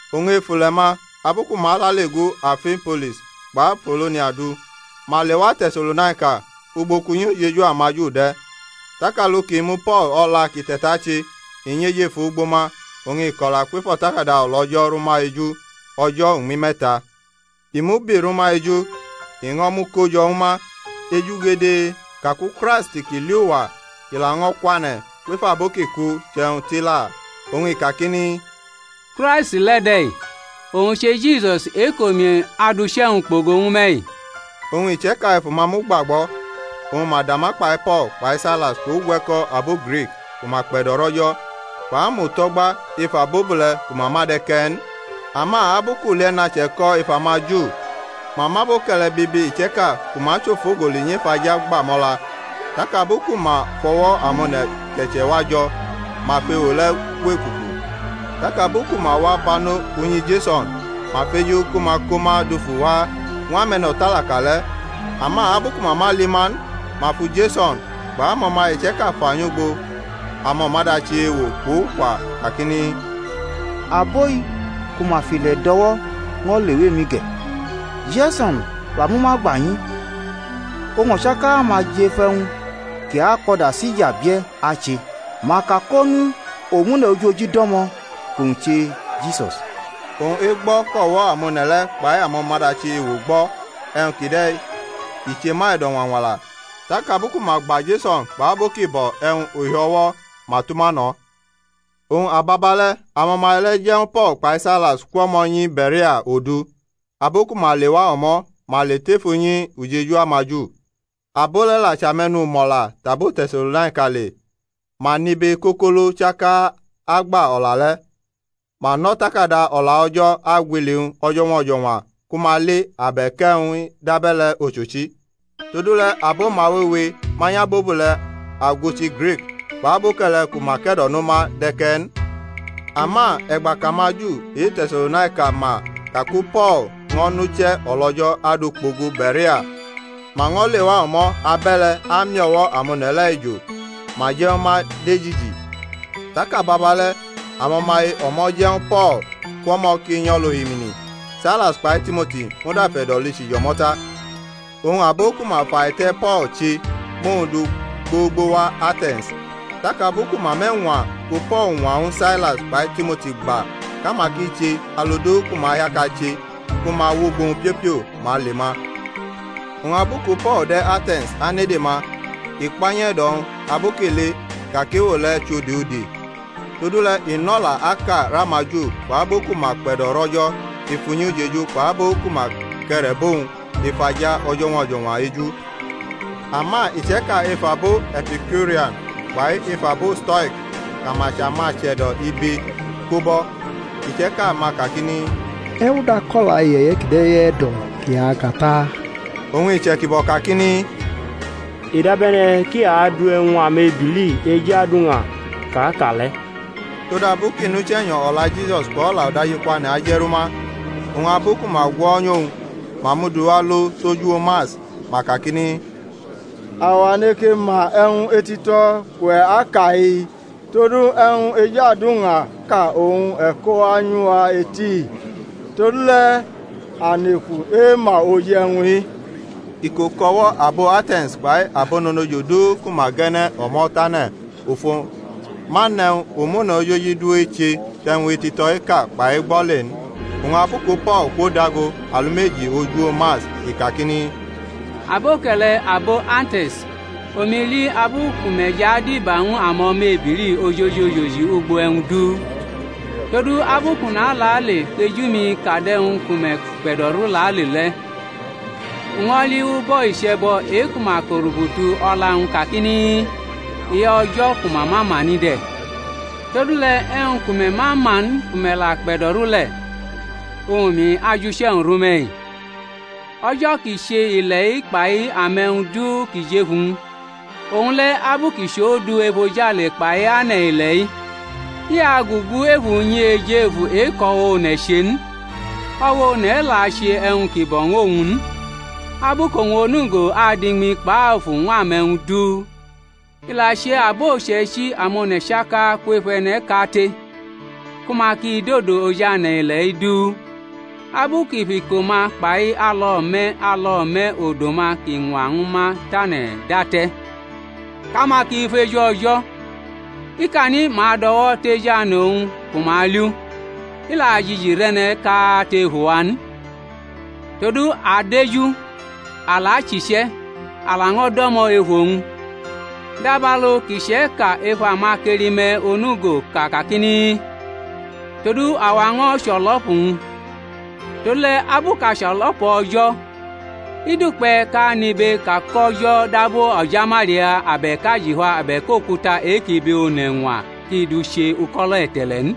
Oñ ef ule̩-ma abu ku ma lale gu Amfipolis kpʼApolonia du ma lewa Te̩se̩lonaika, ugbo kʼunyi ujeju amaJu de̩. Tak alu ki mu Po̩l o̩la kʼi te̩tache, i nyʼejefu ugbo ma, oñ i kʼo̩la kwef O̩takada O̩la O̩jo̩ rʼuma eju o̩jo̩ uñmi me̩ta, i mubi rʼuma eju, i ño̩ muko jo̩ ñw ma ejugede kaku Kraisti ki li uwa kʼi laño̩ akwane̩ kwef abo ki ku chʼe̩wñ tila, oñ i kakini, Kraisti le̩ de̩-i, owñ che Jisus e-kʼomi adʼuche̩-wñ kpogo ñw me̩-i. Oñ iche̩ka ef uma mʼu gbagbo̩, oñ ma dama kpai Po̩l kpai Sailas kpʼugwe̩ko̩ abo Grik ku ma kpe̩do̩rʼO̩jo̩ kpʼamuto̩gba ef abobule̩ ku ma ma de̩ ke̩ n. Ama abu kʼulie̩na che̩ko̩ ef amaJu ma mʼaboke̩le̩ bibi iche̩ka ku ma chʼofogoli nyef aja gba mʼo̩la, tak abu ku ma fʼo̩wo̩ amone̩ ke̩che̩ wa jo̩ ma fʼewo le̩ gwʼekuku; tak abu ku ma wa bano unyi Jeso̩n ma feju ku ma ko ma dufu wa ñw ame̩no̩talaka le̩. Ama abu ku ma ma li ma n, ma fu Jeso̩n kpʼamo̩maye iche̩ka fa nyʼugbo amo̩ma-dachi ewo kpʼukwa kakini, Abo-i ku ma fʼile̩ do̩wo̩ ño̩ lewa emi ge̩. Jeso̩n la mʼuma gba nyi; oñ o̩chaka-ma jʼef e̩wñ ki akpʼo̩da Sisa bie̩ ache, ma ka kʼonu omune̩ ojoji do̩mo̩ kʼowñ che Jisus. Oñ egbo̩ kʼo̩wo̩ amone̩ le̩ kpai amo̩madachi ewo gbo̩ e̩wñ kjde̩ i che ma e̩do̩ñwañwala. Tak abu ku ma gba Jeso̩n kpʼabo ki bo̩ e̩wñ uhio̩wo̩ ma tʼuma no̩. Oñ ababale̩ amo̩maye le̩ je̩ ñw Po̩l kpai Sailas kwʼo̩mo̩ nyi Be̩rea odu, abu ku ma lewa o̩mo̩ ma le tef unyi ujeju amaJu. Abo le̩ la chʼame̩numo̩la tʼabo Te̩se̩lonaika le. Ma nʼibe kokolo chaka agba o̩la le̩, ma nʼO̩takada O̩la O̩jo̩ agwili-wñ o̩jo̩ñwa o̩jo̩ñwa ku ma li abe̩k e̩wñ-i dʼabe̩le̩ ochochi. Todule̩ abo-ma wewe manyʼabobule̩ aguchi Grik kpʼaboke̩le̩ ku ma ke̩do̩no ma de̩ ke̩ n. Ama e̩gba kʼamaJu e-Te̩se̩lonaika ma kaku Po̩l ño̩ nʼuche̩ o̩lO̩jo̩ adu kpogo Be̩rea ma ño̩ lewa o̩mo̩ abe̩le̩ ami o̩wo̩ amone̩ le̩ ejo, ma je̩ ñw ma dejiji. Tak ababale̩ amo̩maye o̩mo̩ je̩ ñw Po̩l kwʼo̩mo̩ kʼi nyʼo̩lʼohimini; Sailas kpai Timoti muda fe̩do̩lichi jʼo̩mo̩ ta. Oñ abo ku ma fʼaite̩ Po̩l che mʼowñ du gbogbo wa Ate̩ns; tak abu ku ma mʼe̩ñwa ku Po̩l ñwa ñw Sailas kpai Timoti gba kʼama ki che alu du ku ma hiaka che ku ma awʼugbo-wñ piopio, ma le ma. Oñ abu ku Po̩l de̩ Ate̩ns anede ma, i kpa nyʼe̩do̩-wñ abu kʼi li ka kʼewo le̩ chʼode ode. Todule̩ i nʼo̩la aka rʼamaJu kpʼabo ku ma kpe̩do̩rʼO̩jo̩ ef unyi ujeju kpʼabo ku ma ke̩re̩bʼowñ ef aja o̩jo̩ñwa o̩jo̩ñwa eju. Ama iche̩ka ef abo Epikiurian kpai ef abo Stoik kʼama chʼamache̩do̩ ibe ko bʼo̩. Iche̩ka-ma kakini, E̩wñ dʼako̩la iye̩ye̩ kide̩ e̩do̩ kʼi aka ta? oñ iche̩jibo kakini, i dabe̩ne̩ kʼi adu e̩wñ amebili ejuaduñaʼka ka le̩: todabu kʼi nʼUche̩nyo̩ o̩la Jisus kpʼo̩la udajikwane̩ aje̩ru ma. Oñ abu ku ma gwo̩nyʼowñ, ma mʼu du alo tʼoj uwo Mars, ma kakini, Awa neke ma e̩wñ etito̩ kʼuwe̩ aka-i? Todu e̩wñ ejuaduñaʼka oñ e̩ kowa nyʼuwa eti-i. Todule̩ a neku ema oji e̩wñ-i. Iko kʼo̩wo̩ abo Ate̩ns kpai abononojo du ku ma ge̩ne̩ o̩mo̩ tane̩ ofo ma nʼe̩wñ omune̩ ojoji du eche tʼe̩wñ etito̩ eka kpai egbo̩ le n. Oñ abu ku Po̩l kwodago alumeji oj uwo Mars, i kakini: Po̩l ko̩la oj uwo Mars Aboke̩le̩ abo Ate̩ns, omi li abu ku me̩ jʼadiba ñw amo̩mebili ojoji ojoji ugbo e̩wñ du; todu abu kʼu nalale kʼeju-mi kadʼe̩wñ ku me̩ kpe̩do̩ru lale le̩, u ño̩ li ubo̩ iche̩bo̩ e-ku ma ko̩rubutu o̩la-wñ kakini, E-O̩JO̩ KU MA MA MA NI DE̩. Todule̩ e̩wñ ku me̩ ma ma n ku me̩ la kpe̩do̩ru le̩, oñ omi ajʼuche̩-wñ rʼume̩-i. O̩jo̩ kʼi che ile̩-i kpai ame̩wñ du ki jʼef uwñ, owñ le̩, abu kʼi chʼOndu efojale kpai ane̩-ile̩-i, i agugu ef unyi ejefu e-kʼo̩wo̩ one̩ che n, o̩wo̩ one̩ la ache e̩wñ ki bo̩ ñw owñ n, abu kʼowñ onugo adu iñmi kpʼafu kpʼe̩wñ du ñw ame̩wñ du; I la che abo uche̩ichi amone̩ chaka kwef e̩ne̩ kate, ku ma ki dodo oj ane̩-ile̩-i du, abu kʼi fʼiko-ma kpai alo̩me̩ alo̩me̩ odo-ma kʼi ñwa ñwu ma tane̩ date̩; kʼama ki feju O̩jo̩, ikani ma adʼo̩wo̩ tejane̩ owñ, ku ma li u, i la jiji rʼe̩ne̩ kate ef uwa n: todu a adeju, a la achiche̩, a laño̩ do̩mo̩ ef owñ, dabalu kʼiche̩ka ef amakeli-me̩ onugo ka kakini, Todu awa ño̩ chʼo̩lo̩pu-wñ. Todule̩ abu kʼa chʼo̩lo̩pu O̩jo̩, i dukpe̩ kʼa nʼibe ka kʼO̩jo̩ dab o̩jamalia abe̩k ajifa abe̩k okuta e-kʼibe one̩ ñwa kʼi du che uko̩lo̩ e̩te̩le̩ n.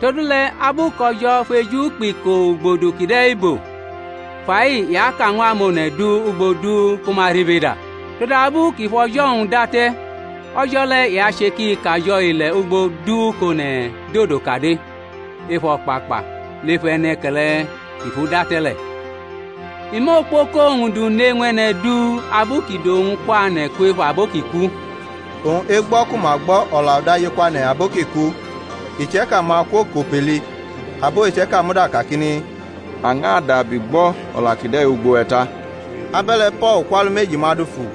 Todule̩ abu kʼO̩jo̩ fʼeju kpʼiko ugbodu kide̩ bo, fa-i i aka ñw amone̩ du ugbo du ku ma ribeda: todabu kʼi fʼo̩jo̩-wñ date̩, o̩jo̩ le̩ i ache kʼi kajo̩ ile̩ ugbo du kʼone̩ dodo kade ef o̩kpakpa lef E̩ne̩ke̩le̩ kʼi fʼu date̩ le̩. I mʼokpoko-wñ du ne ñw e̩ne̩ du, abu kʼi dʼowñ kwane̩ kwef abo ki ku. Oñ egbo̩ ku ma gbo̩ o̩la udajikwane̩ abo ki ku, iche̩ka ma kwokʼopeli; abo iche̩ka muda kakini, A ñʼadabi gbo̩ o̩la kide̩ ugbo we̩ ta. Abe̩le̩ Po̩l kwʼalumeji-ma dufu.